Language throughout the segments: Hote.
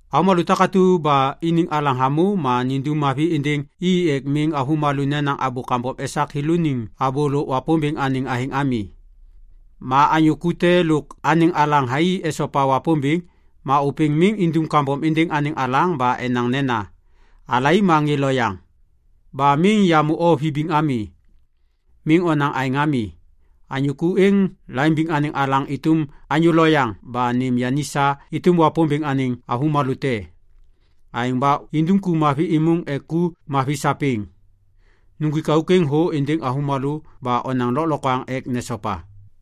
Avômalô takatu ba iniŋ alaŋ hamô ma nindum mavi êndêŋ i ek miŋ avômalô nenaŋ abô kambom esak yêlôaniŋ abô lôk Wapômbêŋ anêŋ athêŋ ami. Ma anyô ku te lôk anêŋ alaŋ thai esopa Wapômbêŋ, ma ôpêŋ miŋ indum kambom êndêŋ anêŋ alaŋ ba enaŋ nena, “Alai ma ŋê loyaŋ. Ba miŋ yamô o vibiŋ ami.” Miŋ onaŋ aêŋ ami. Anyô ku êŋ laimbiŋ anêŋ alaŋ êtôm anyô loyaŋ ba nêm yani sa êtôm Wapômbêŋ anêŋ avômalô te. Aêŋ ba indum ku mavi êmôŋ ek ku mavi sapêŋ. Nuŋgwik auk êŋ thô êndêŋ avômalô ba onaŋ lôklokwaŋ ek nesopa.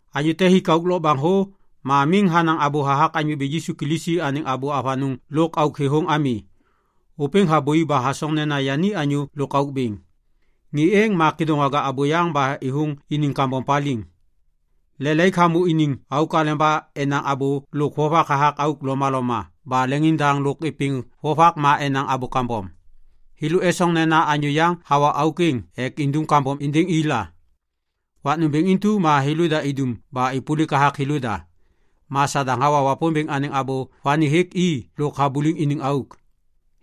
Anyô te hik auk lokbaŋ thô ma miŋ hanaŋ abô hathak Anyô Bêŋ Yisu Kilisi anêŋ abô avanôŋ lôk auk thêthôŋ ami, ôpêŋ habôi ba hasoŋ nena yani anyô lôk auk bêŋ. Ŋê êŋ ma kêdôŋwaga abôyaŋ ba êthôŋ iniŋ kambom paliŋ. Lelaik hamô iniŋ auk aleba enaŋ abô lôk vovak hathak auk lomaloma ba leŋiŋdaŋ lôk êpêŋ vovak ma enaŋ abô kambom. Thêlô esoŋ nena anyô yaŋ hawa auk êŋ ek indum kambom êndêŋ i la. Wak nômbêŋ intu ma thêlôda idum ba êpôlik hathak thêlôda. Ma Sadaŋ hawa Wapômbêŋ anêŋ abô vani hêk i lôk habuliŋ iniŋ auk.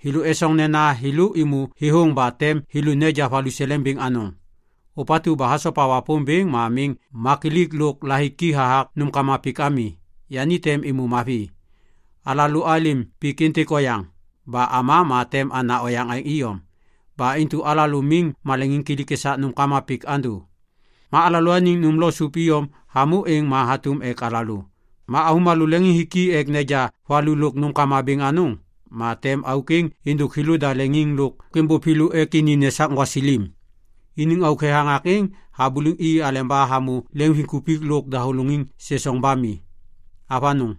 Thêlô esoŋ nena thêlô êmô thêthôŋ ba tem thêlô neja valuseleŋ bêŋ anôŋ. Ôpatu ba hasopa Wapômbêŋ ma miŋ makilik lôk la hiki hathak nômkama pik ami, yani tem êmô mavi. Alalô alêm pik êntêk oyaŋ. Ba ama ma tem ana oyaŋ aêŋ iyom. Ba intu alalô miŋ maleŋiŋkilik esak nômkama pik andô. Ma alalôaniŋ nôm lôk sôp iyom hamô êŋ ma hatôm ek alalô. Ma avômalô leŋiŋ hiki ek neja valu lôk nômkama bêŋ anôŋ, ma tem auk êŋ êndôk thêlô leŋiŋ lôk êmbôv thêlô ek ini nesak gwasilim. Iniŋ auk thethaŋak êŋ habuliŋ i aleba hamô leŋviŋkupik lôk dahôlôŋiŋ sesoŋ ba mi. Avanôŋ!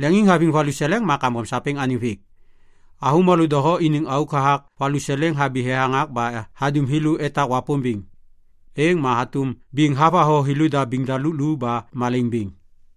Leŋiŋhaviŋ valuseleŋ ma kambom sapêŋ anêŋ vêk. Avômalô doho iniŋ auk hathak valuseleŋ habi thethaŋak ba hadum thêlô etak Wapômbêŋ. Êŋ ma hatôm biŋ havatho thêlôda biŋ daluk lu ba malaiŋ bêŋ.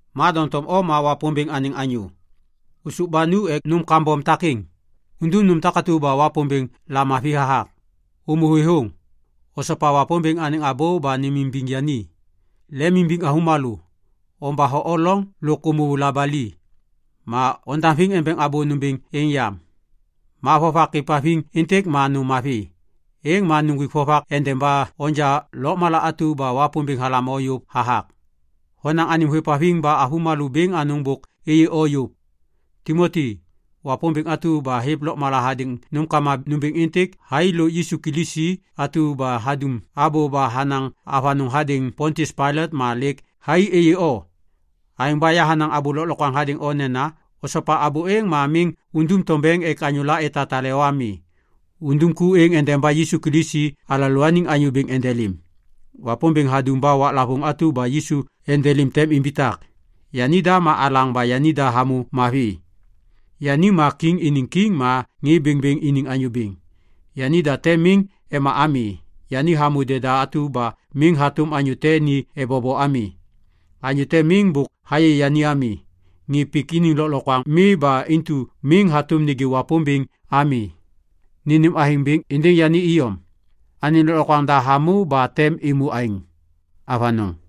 Ma doŋtom o ma Wapômbêŋ anêŋ anyô. Ôsôv ba nu ek nôm kambom takêŋ. Undum nôm takatu ba Wapômbêŋ lamavi hathak. Ômô thêthôŋ. Osopa Wapômbêŋ anêŋ abô ba nêmimbiŋ yani. Lemimbiŋ avômalô. Ombatho o loŋ lôk ômô labali. Ma ondaŋviŋ embeŋ abô nômbêŋ êŋ yam. Ma vovak êvhaviŋ êntêk ma nôm mavi. Êŋ ma nuŋgwik vovak endeba onja lôkmala atu ba Wapômbêŋ halam o yôv hathak. Honaŋ anêm hôêvhaviŋ ba avômalô bêŋ anôŋ bôk êyê o yôv. Timoti, Wapômbêŋ atu ba hêv lôkmala hadêŋ nômkama nômbêŋ êntêk thai lôk Yisu Kilisi atu ba hadum abô ba hanaŋ avanôŋ hadêŋ Pontius Pailat ma lêk thai êyê o. Aêŋ ba yahanaŋ abô lôklokwaŋ hadêŋ o nena osopa abô êŋ ma miŋ undum tombeŋ ek anyôla etatale o ami. Undum ku êŋ endeba Yisu Kilisi alalôaniŋ Anyô Bêŋ endelêm. Wapômbêŋ hadum ba waklavôŋ atu ba Yisu endelêm tem imbitak. Yanida ma alaŋ ba yanida hamô mavi. Yani ma Kiŋ iniŋ Kiŋ ma ŋê bêŋbêŋ iniŋ Anyô Bêŋ. Yanida tem miŋ ema ami. Yani hamô deda atu ba miŋ hatôm anyô te ni ebobo ami. Anyô te miŋ bôk hayê yani ami. Ŋê pik iniŋ lôklokwaŋ mi ba intu miŋ hatôm nêgê Wapômbêŋ ami. Nênêm athêŋ bêŋ êndêŋ yani iyom. Anêŋ lôklokwaŋ da hamô ba tem êmô aêŋ. Avanôŋ.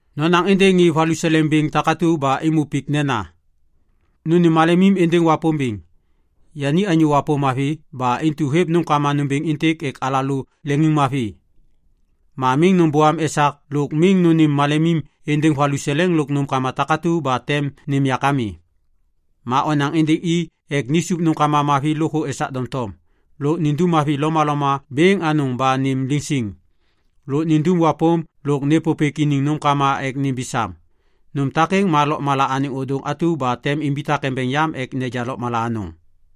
Nonaŋ êndêŋ ŋê valuseleŋ bêŋ takatu ba êmô pik nena, “Nônêm malemim êndêŋ Wapômbêŋ. Yani anyô wapôm mavi ba intu hêv nômkama nômbêŋ êntêk ek alalô leŋiŋmavi. Ma miŋ nômbôam esak lôk miŋ nônêm malemim êndêŋ valuseleŋ lôk nômkama takatu ba tem nêm yak ami.” Ma onaŋ êndêŋ i ek nisup nômkama mavi lôkthô esak doŋtom. Lôk nindum mavi lomaloma bêŋ anôŋ ba nêm liŋ siŋ. Lôk nindum wapôm lôk nêpôpêk iniŋ nômkama ek nimbi sam. Nôm takêŋ ma lôkmala anêŋ ôdôŋ atu ba tem imbitak embeŋ yam ek neja lôkmala anôŋ.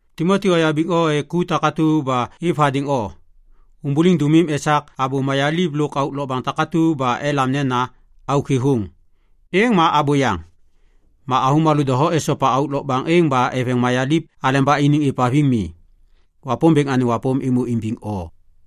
Timoti oyabiŋ o ek ku takatu ba êv hadêŋ o. Ômbôliŋ dômim esak abô mayaliv lôk auk lokbaŋ takatu ba elam nena “auk thêthôŋ”. Êŋ ma abôyaŋ. Ma avômalô doho esopa auk lokbaŋ êŋ ba eveŋ mayaliv aleba iniŋ êvhaviŋ mi. Wapômbêŋ anêŋ wapôm êmô imbiŋ o.